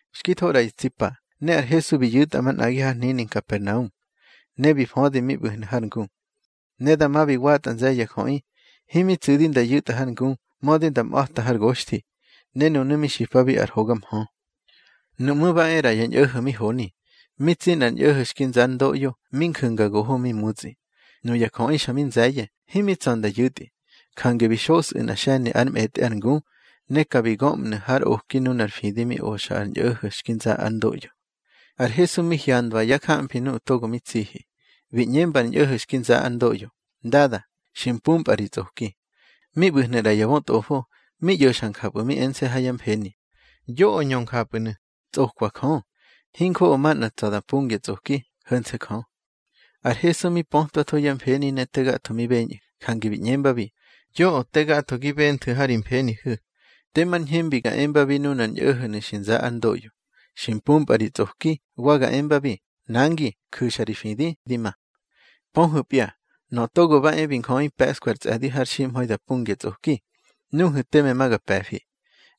Xki tho ꞌra ya tsi pa, ne ar Hesu bi yu̱tꞌa manꞌagi har hnini Nkapernaum, ne bi födi mi ꞌbu̱hnu̱ har ngu. Ne dama bi watꞌa nze̱ye̱ ya jöꞌi. Himi tsu̱di nda yu̱tꞌa har ngu, mödi nda mꞌa̱ta har goxthi, ne nunu̱ mi xipabi ar hoga mhö. Nuꞌmú̱ ba e ꞌra ya ñꞌo̱ho̱ mi honi, mi tsi nꞌar ñꞌo̱ho̱ xki nza ár ndoꞌyo, mi nju̱nga goho mi mutsꞌi. Nuya jöꞌi xa mi nze̱ye̱, himi tsa̱ nda yu̱tꞌi. Jange bi xosꞌu̱ nꞌa xe̱ni ár mꞌetꞌe ar ngu, ne ka bi göꞌmnu̱ har oki nunar fidi mi oxa ar ñꞌo̱ho̱ xki nza ár ndoꞌyo. Ar Hesu mi hyandwa yá jamfi nuꞌu̱ togo mi tsihi, bi ꞌñemba ar ñꞌo̱ho̱ xki nza ár ndoꞌyo: —Ndada, xi mpumpꞌa ri tsꞌoki. Mi ꞌbu̱hnu̱ ꞌra ya bötꞌofo, mi ꞌyo̱xa njapꞌu̱ mi ense̱ ha yá mfeni: Yoꞌö ñö njapꞌu̱nu̱. Tsꞌokwa Jö. Hinjoꞌo manꞌa tsa̱ da pungya tsꞌoki, ho̱nse̱ Jö. Ar Hesu mi pötwatho yá mfeni ne te gatho mi beñꞌu̱, jange bi ꞌñembabi: —Yoꞌö te gatho gi benthu̱ ha ri mfenihu̱. Temar ñhembi ga embabi nunar ñꞌo̱ho̱nu̱ xi nza ár ndoꞌyo: Xi mpumpꞌa ri tsꞌoki, wa ga embabi: Nangi, ju̱xa ri fidi, di ma. Pöhu̱pya, Nöꞌö Togo ba e bi Njöꞌi pe̱ꞌskwa ar tsꞌe̱di har ximha̱i da pungya tsꞌoki, nuhu̱ teme ma ga pe̱fi.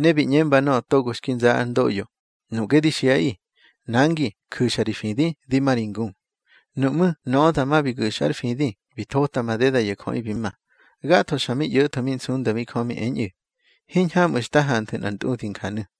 Ne bi ꞌñemba nöꞌö togo xki nza ár ndoꞌyo: —Nuꞌge di xiꞌaꞌi: Nangi, ju̱xa ri fidi, di ma ri ngu. Nuꞌmú̱ nöꞌö dama bi gu̱xa ár fidi, bi thota madeda ya jöꞌi bi ma. Gatho xa mi ꞌyo̱tho mi nsundabi Jö mi eñꞌu̱: —Hiñhamꞌu̱ xta hanthu̱ nꞌar ntꞌudi njanu̱.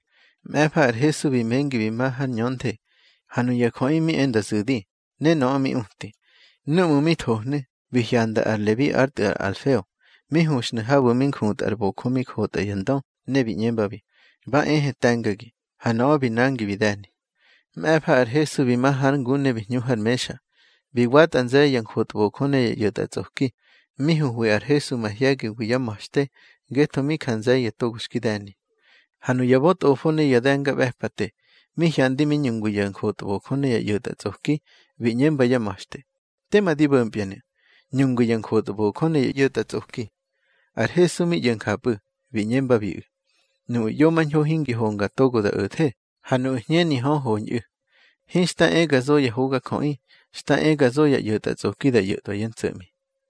Mꞌe̱fa ar Hesu bi mengi bi ma har ñönthe, ha nuya jöꞌi mi e nda zu̱di, ne nöꞌö mi uti. Núꞌmu̱ mi thohnu̱, bi hyanda ar Lebi ár tꞌu̱ ar Alfeo, mi huxnu̱ habu̱ mi njutꞌa ar bojö mi jotꞌa ya ndö, ne bi ꞌñembabi: —Ba ehe te̱ngagi. Ha nöꞌö bi nangi bi de̱ni. Mꞌe̱fa ar Hesu bi ma hár ngu ne bi hñu har mexa. Bi watꞌa nze̱ye̱ ya njotbojö ne ya ꞌyo̱tꞌatsꞌoki, mi huhwi ar Hesu mahye̱giwi yá ma̱xte, ngetho mi ja nze̱ye̱ togo xki de̱ni. Ha nuya bötꞌofo ne ya de̱ngaꞌbe̱pate, mi hyandi mi ñungwi ya njotbojö ne ya ꞌyo̱tꞌatsꞌoki, bi ꞌñemba yá ma̱xte: —Tema di bo̱mpyanu̱, ñungwi ya njotbojö ne ya ꞌyo̱tꞌatsꞌoki. Ar Hesu mi ꞌyo̱ njapꞌu̱, bi ꞌñembabiꞌu̱: —Nuꞌu̱ ꞌyomañho hingi honga togo da o̱the, ha nuꞌu̱ hñeni hö, hoñꞌu̱. Hinxta e ga zo ya hogajöꞌi, xta e ga zo ya ꞌyo̱tꞌatsꞌoki da ꞌyo̱tꞌwa yá ntso̱ꞌmi.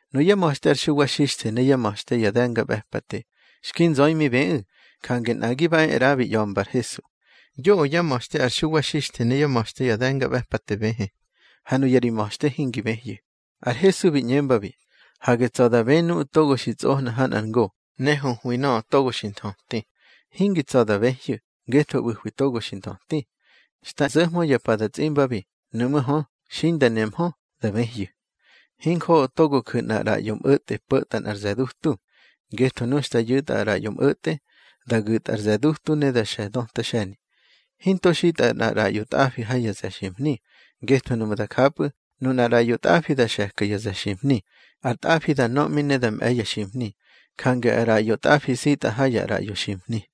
Nuyá ma̱xte ar Xuwa Xixthe ne yá ma̱xte ya de̱ngaꞌbe̱pate, xki nzöi mi bëꞌu̱. Jange nꞌagi ba e ꞌra, bi ꞌya̱mba ar Hesu: —Yoꞌö yá ma̱xte ar Xuwa Xixthe ne yá ma̱xte ya de̱ngaꞌbe̱pate bëhë, ha nuya ri ma̱xte hingi bëhyu̱. Ar Hesu bi ꞌñembabi: —Hage tsa̱ da bë nuꞌu̱ togo xi tsꞌohna ha nꞌar ngo ne huhwi nöꞌö togo xi nthöti. Hingi tsa̱ da bëhyu̱, ngetho ꞌbu̱hwi togo xi nthöti. Xta zo̱hmö ya pa da tsꞌimbabi; nuꞌmú̱ hö, xi inda nehmö, da bëhyu̱. Hinjoꞌo togo ju̱ nꞌar ꞌraꞌyo mꞌo̱tꞌe po̱ta nꞌar ze̱ dutu. Ngetho nu xta yu̱tꞌa ar ꞌraꞌyo mꞌo̱tꞌe, da gu̱tꞌa ar ze̱ dutu ne da xe̱ döta xe̱ni. Hinto xitꞌa ar ꞌraꞌyo tꞌafi ha ya ze̱ ximhni. Ngetho nuꞌmu̱ da japꞌu̱, nunar ꞌraꞌyo tꞌafi da xe̱ka ya ze̱ ximhni, ar tꞌafi da nöꞌmi ne da mꞌe̱ ya ximhni. Jange ar ꞌraꞌyo tꞌafi nsitꞌa ha ya ꞌraꞌyo ximhni.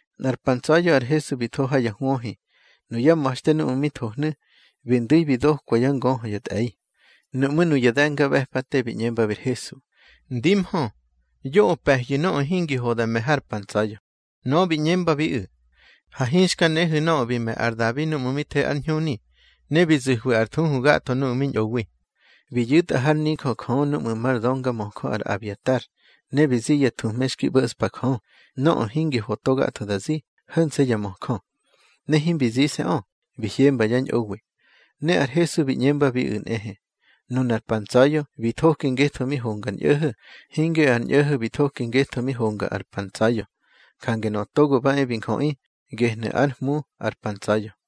Nꞌar pa ntsa̱ya̱ ar Hesu bi tho ha ya hwöhi. Nuyá ma̱xte núꞌmu̱ mi thohnu̱, bi ndu̱i bi dokwa yá ngöhö ya tꞌe̱i. Nuꞌmú̱ nuya de̱ngaꞌbe̱pate bi ꞌñembabi ar Hesu: —Ndimhö, yoꞌö pe̱hyu̱ nöꞌö hingi ho da me̱ har pa ntsa̱ya̱. Nöꞌö bi ꞌñembabiꞌu̱: —Ha hinxka nehu̱ nöꞌö bi me̱ ar Dabi núꞌmu̱ mi the ar ñhuni, ne bi zu̱hwi ar thuhu gatho nuꞌu̱ mi ñꞌowi. Bi yu̱tꞌa hár nijö Jö núꞌmu̱ mar döngamöjö ar Abiatar, ne bi zi ya thuhme xki ꞌbo̱ꞌspa Jö, nöꞌö hingi ho to gatho da zi, ho̱nse̱ ya möjö. Ne himbi zise̱ꞌö, bi hyemba yá ñꞌowi. Ne ar Hesu bi ꞌñembabiꞌu̱ nꞌehe: —Nunar pa ntsa̱ya̱ bi thoki ngetho mi honga ar ñꞌo̱ho̱, hinge ar ñꞌo̱ho̱ bi thoki ngeꞌö mi honga ar pa ntsa̱ya̱. Jange Nöꞌö Togo ba e bi Njöꞌi, gehnu̱ ár Hmu ar pa ntsa̱ya̱.